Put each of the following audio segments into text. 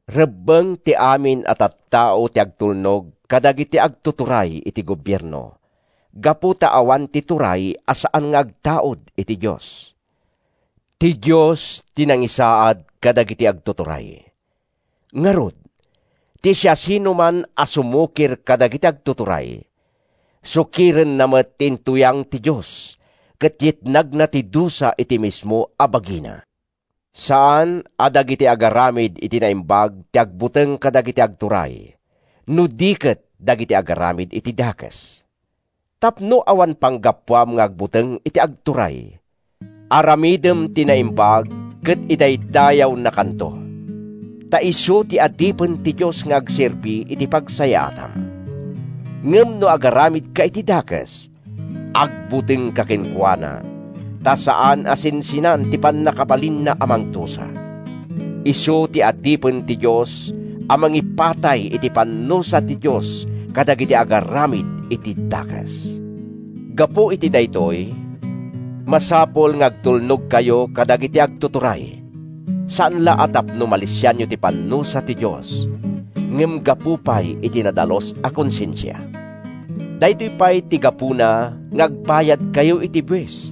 Rebbeng ti amin a tattao ti agtulnog kadagiti agtuturay iti gobierno gapu ta awan ti turay a saan nga agtaud iti Dios. Ti Dios ti nangisaad kadagiti agtuturay. Ngarud, ti siasinoman a sumukir kadagiti agtuturay, sukirenna met ti intuyang ti Dios ket yegna ti dusa iti mismo a bagina. Saan a dagiti agaramid iti naimbag ti agbuteng kadagiti agturay no di ket dagiti agaramid iti dakes. Tapno awan panggapuam nga agbuteng iti agturay, aramidem ti naimbag ket idaydayawnakanto. Ta isu ti adipen ti Dios nga agserbi iti pagsayaatam. Ngem no agaramidka iti dakes, agbutengka kenkuana, ta saan a sinsinan ti pannakabalinna a mangdusa. Isu ti adipen ti Dios a mangipatay iti pannusa ti Dios kadagiti agaramid iti dakes. Gapu iti daytoy, masapul nga agtulnogkayo kadagiti agtuturay, saan la a tapno malisianyo ti pannusa ti Dios, ngem gapu pay iti nadalus a konsensia. Daytoy pay ti gapuna nga agbayadkayo iti buis.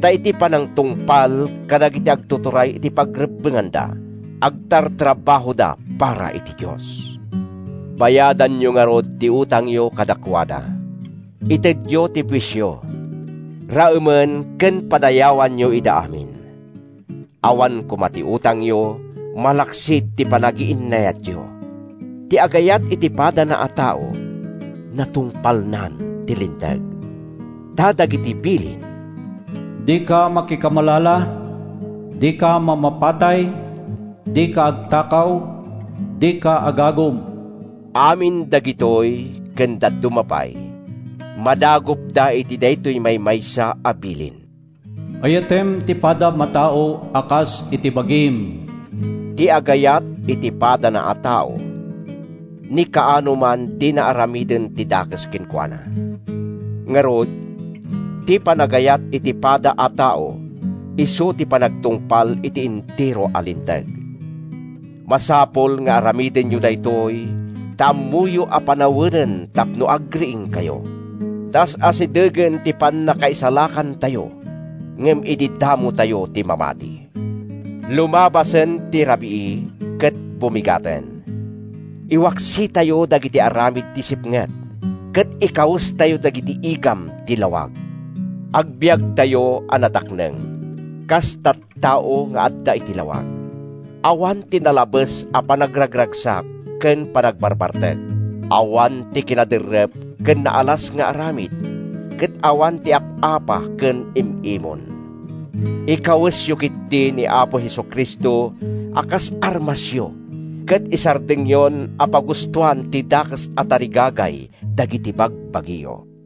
Ta iti panangtungpal dagiti agtuturay iti pagrebbenganda, agtartrabahoda para iti Dios. Bayadanyo ngarud ti utangyo kadakuada. Itedyo ti buisyo. Raemen ken padayawanyo ida amin. Awan koma ti utangyo malaksid ti panagiinnayatyo. Ti agayat iti padana a tao, natungpalnan ti Linteg. Ta dagiti bilin: “Dika makikamalala, dika mamapatay, dika agtakaw, dika agagum”—amin dagitoy ken dadduma pay, madagupda iti daytoy maymaysa a bilin: “Ayatem ti padam a tao a kas iti bagim.” Ti agayat iti padana a tao, ni kaano man dina aramiden ti dakes kenkuana. Ngarud, ti panagayat iti pada a tao isu ti panagtungpal iti entero a Linteg. Masapul nga aramidenyo daytoy ta ammoyo a panawenen tapno agriingkayo. Ta as-asidegen ti pannakaisalakantayo ngem idi damotayo ti mamati. Lumabasen ti rabii ket bumigaten. Iwaksitayo dagiti aramid ti sipnget ket ikawestayo dagiti igam ti lawag. Agbiagtayo a natakneng, kas tattao nga adda iti lawag. Awan ti nalabes a panagragragsak ken panagbarbartek, awan ti kinaderrep ken naalas nga aramid, ket awan ti ap-apa ken im-imon. Ikawesyo ketdi ni Apo Jesu-Cristo a kas armasyo ket isardengyon a pagustoan ti dakes a tarigagay dagiti bagbagiyo.